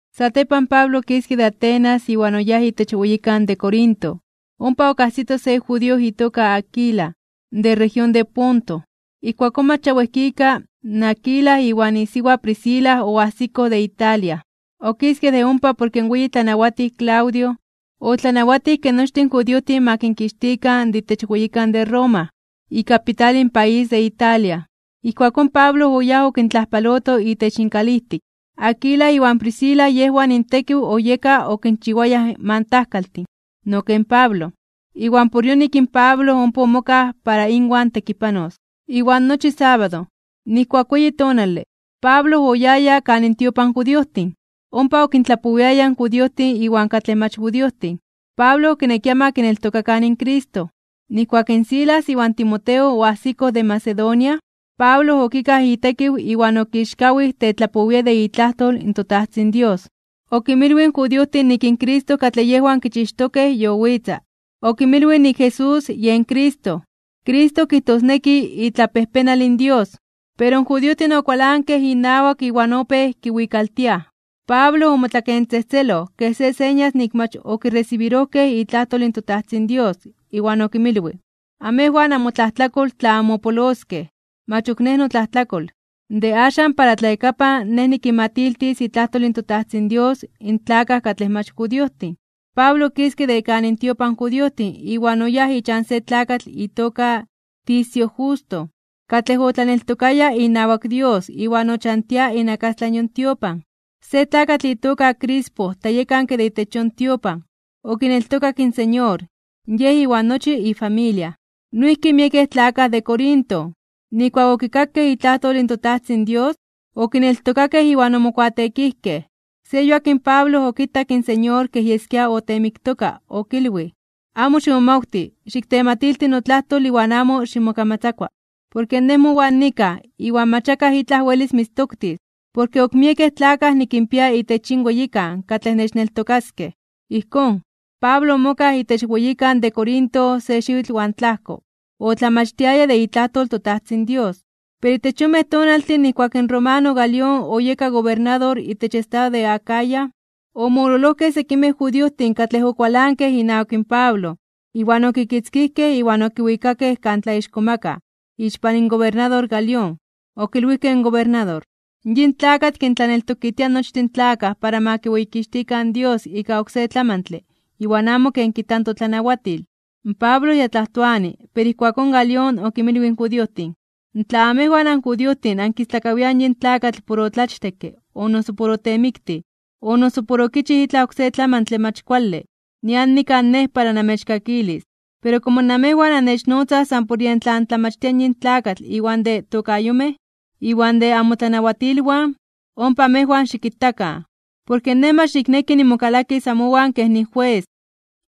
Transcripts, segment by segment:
Satepan, Pablo okiske de Atenas iwan oyáj itech weyikan de Corinto. Ompa okajsito se judío itoka Aquila, de región de Ponto. Ijkuakón mach ya wejkika, in Aquila iwan isiwa Priscila oajsikoj de Italia, okiskej de ompa porke in weyi tlanawatij Claudio, otlanawatij ke nochtin in judiojtin ma kinkixtikan de itech weyikan de Roma, ikapital in país de Italia. Ijkuakón Pablo oyáj okintlajpaloto itech inkalijtik. Aquila iwan Priscila yejwan intekiw oyeka okinchiwayaj mantajkaltin, no ken Pablo, iwan por yonik in Pablo ompa omokaj para inwan tekipanos. Iwan nochi sábado, nijkuak weyi tonale, Pablo oyaya kan intiopan in judiojtin. Ompa okintlapowiaya in judiojtin iwan katlej mach judiojtin. Pablo okinekia ma kineltokakan in Cristo. Nijkuak in Silas iwan Timoteo oajsikoj de Macedonia, Pablo okikaj itekiw iwan okixkawij (omomelij) tetlapowia de itlajtol in toTajtzin Dios. Okinmilwij in judiojtin nik in Cristo katlej yejwan kichixtokej yowitza. Okinmilwij nik in Jesús yen Cristo. Cristo kijtosneki itlapejpenal in Dios. Pero in judiojtin okualankej inawak iwan opéj kiwikaltiaj. Pablo omotlakentzejtzeloj kej se señas nik mach okiresibirojkej itlajtol in toTajtzin Dios, iwan okinmilwij: ―Amejwan namotlajtlakol tla anmopoloskej. Mach ok nej notlajtlakol. De axan para tlayakapan nej nikinmatiltis itlajtol in toTajtzin Dios in tlakaj katlej mach judiojtin. Pablo okiske de kan intiopan in judiojtin iwan oyáj ichan se tlakatl itoka Ticio Justo, katlej otlaneltokaya inawak Dios iwan ochantia inakastlan yon tiopan. Se tlakatl itoka Crispo tlayekanke de itech yon tiopan, okineltokak in Señor, yej iwan nochi ifamilia. Noijki miekej tlakaj de Corinto, nijkuak okikakej itlajtol in toTajtzin Dios, okineltokakej iwan omokuateekijkej. Se yuak in Pablo okitak in Señor kej yeskia oteemiktoka okilwij: ―Amo ximomawti, xiktematilti notlajtol iwan amo ximokamatzakua. Porke Nej mowan nikaj iwan mach akaj itlaj welis mitztoktis, porke ok miekej tlakaj nikinpia itech yin weyikan katlej nechneltokaskej. Ijkón, Pablo omokaj itech weyikan de Corinto se xiwitl iwan tlajko, otlamachtiaya de itlajtol in toTajtzin Dios. Pero itech yonmej tonaltin nijkuak in romano Galión oyeka gobernador itech estado de Acaya, omololojkej sekimej judiojtin katlej okualankej inawak in Pablo iwan okitzkijkej iwan okiwikakej kan tlaixkomakaj (tlatzonmanaj) ixpan gobernador Galión. Okilwijkej in gobernador: ―Yin tlakatl kintlaneltokitia nochtin in tlakaj para ma kiweyikixtikan in Dios ika oksé tlamantle iwan amo ken kijta totlanawatil. Pablo ya tlajtoani, pero ijkuakón Galión okinmilwij in judiojtin: ―Tla amejwan anjudiojtin ankistlakawiaj yin tlakatl por otlachtekke o noso por otemiktij, o noso por okichij itlaj oksé tlamantle mach kuale, nian nikaj nej para namechkakilis. Pero komo namejwan annechnotzaj san por yej tlan tlamachtia yin tlakatl iwan de tokayomej, iwan de amotlanawatilwan, ompa amejwan xikitakan, porke nej mach nikneki nimokalakis amowan kej nijues.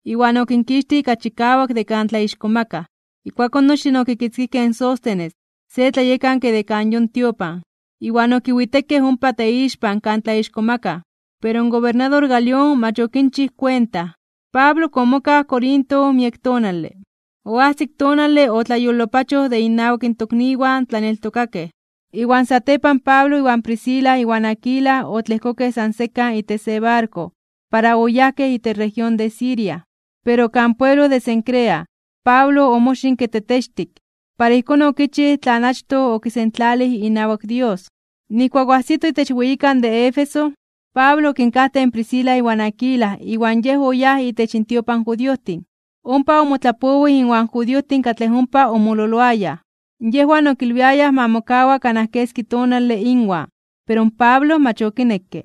Iwan okinkixtij ika chikawak de kan tlaixkomakaj (tlatzonmanaj). Ijkuakón nochtin okitzkijkej in Sóstenes, se tlayekanke de kan yon tiopan, iwan okiwitekej ompa teixpan kan tlaixkomakaj. Pero in gobernador Galión mach okinchij kuenta. Pablo ok omokaj Corinto miek tonale. Oajsik tonale otlayolopachoj de innawak in tokniwan tlaneltokakej, iwan satepan Pablo iwan Priscila iwan Aquila otlejkokej san sekan itech se barko para oyajkej itech región de Siria. Pero kan pueblo de Cencrea, Pablo omoxinke tetextik (kuameloj), para ijkón okichij tlan achtoj okisentlalij inawak Dios. Nijkuak oajsitoj itech weyikan de Éfeso, Pablo okinkajtej in Priscila iwan Aquila iwan yej oyáj itech intiopan in judiojtin, ompa omotlapowij inwan judiojtin katlej ompa omololoayaj. Yejwan okilwiayaj ma mokawa kanaj keski tonale inwan, pero in Pablo mach okinekke.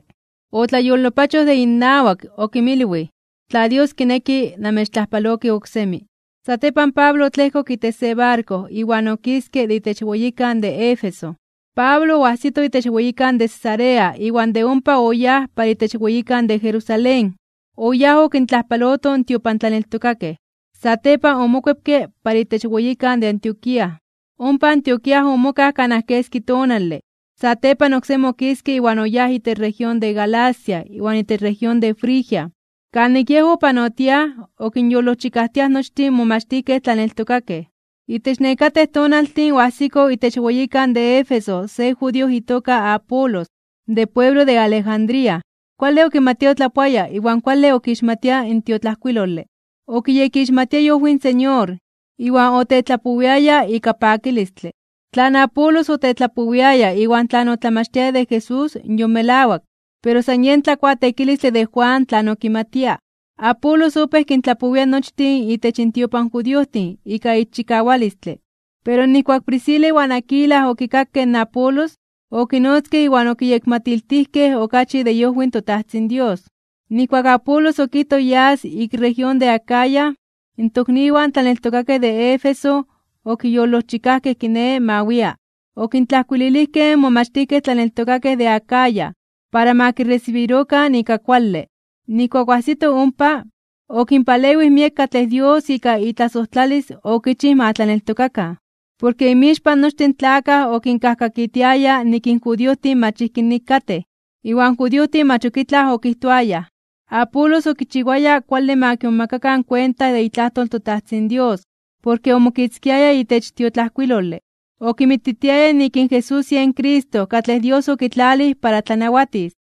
Otlayolopachoj de innawak. Okinmilwij: ―Tla Dios kineki, namechtlajpaloki oksemi. Satepan Pablo otlejkok itech se barko iwan okiske de itech weyikan de Éfeso. Pablo oajsito itech weyikan de Cesarea iwan de ompa oyáj para itech weyikan de Jerusalén. Oyáj okintlajpaloto in tiopantlaneltokakej. Satepan omokuepke para itech weyikan de Antioquía. Ompa Antioquía omokaj kanaj keski tonale. Satepan oksemi okiske iwan oyáj itech región de Galacia iwan itech región de Frigia. Kanik yej opanotiaj okinyolojchikajtiaj nochtin in momachtijkej tlaneltokakej. Itech nekatej tonaltin oajsiko itech weyikan de Éfeso se judío itoka Apolos, de pueblo de Alejandría. Kuale okimatia otlapoaya iwan kuale okixmatia in tiotlajkuilole. Okiyekixmatia iojwi in Señor, iwan otetlapowiaya ika pakilistle. Tlan Apolos otetlapowiaya iwan tlan otlamachtiaya de Jesús yon melawak, pero san yen tlakuateekilistle de Juan tlan okimatia. Apolos opéj kintlapowia nochtin itech intiopan in judiojtin ika ixchikawalistle. Pero nijkuak in Priscila iwan Aquila okikakej in Apolos, okinotzkej iwan okiyekmatiltijkej okachi de iojwi in toTajtzin Dios. Nijkuak in Apolos okijtoj yas ik región de Acaya, in tokniwan tlaneltokakej de Éfeso okiyolojchikajkej kiné ma wia. Okintlajkuililijkej in momachtijkej tlaneltokakej de Acaya para ma kiresibirokan ika kuale. Nijkuak oajsito ompa, okinpalewij miek katlej Dios ika itlasojtlalis okichij ma tlaneltokakan. Porke inmixpan nochtin in tlakaj okinkajkakitiaya nik in judiojtin mach ijki nik katej. Iwan in judiojtin mach ok itlaj okijtoayaj. Apolos okichiwaya kuale ma kimomakakan kuenta de itlajtol in toTajtzin Dios porke omokitzkiaya itech tiotlajkuilole, okinmititiaya nik in Jesús yen Cristo katlej Dios okitlalij para tlanawatis.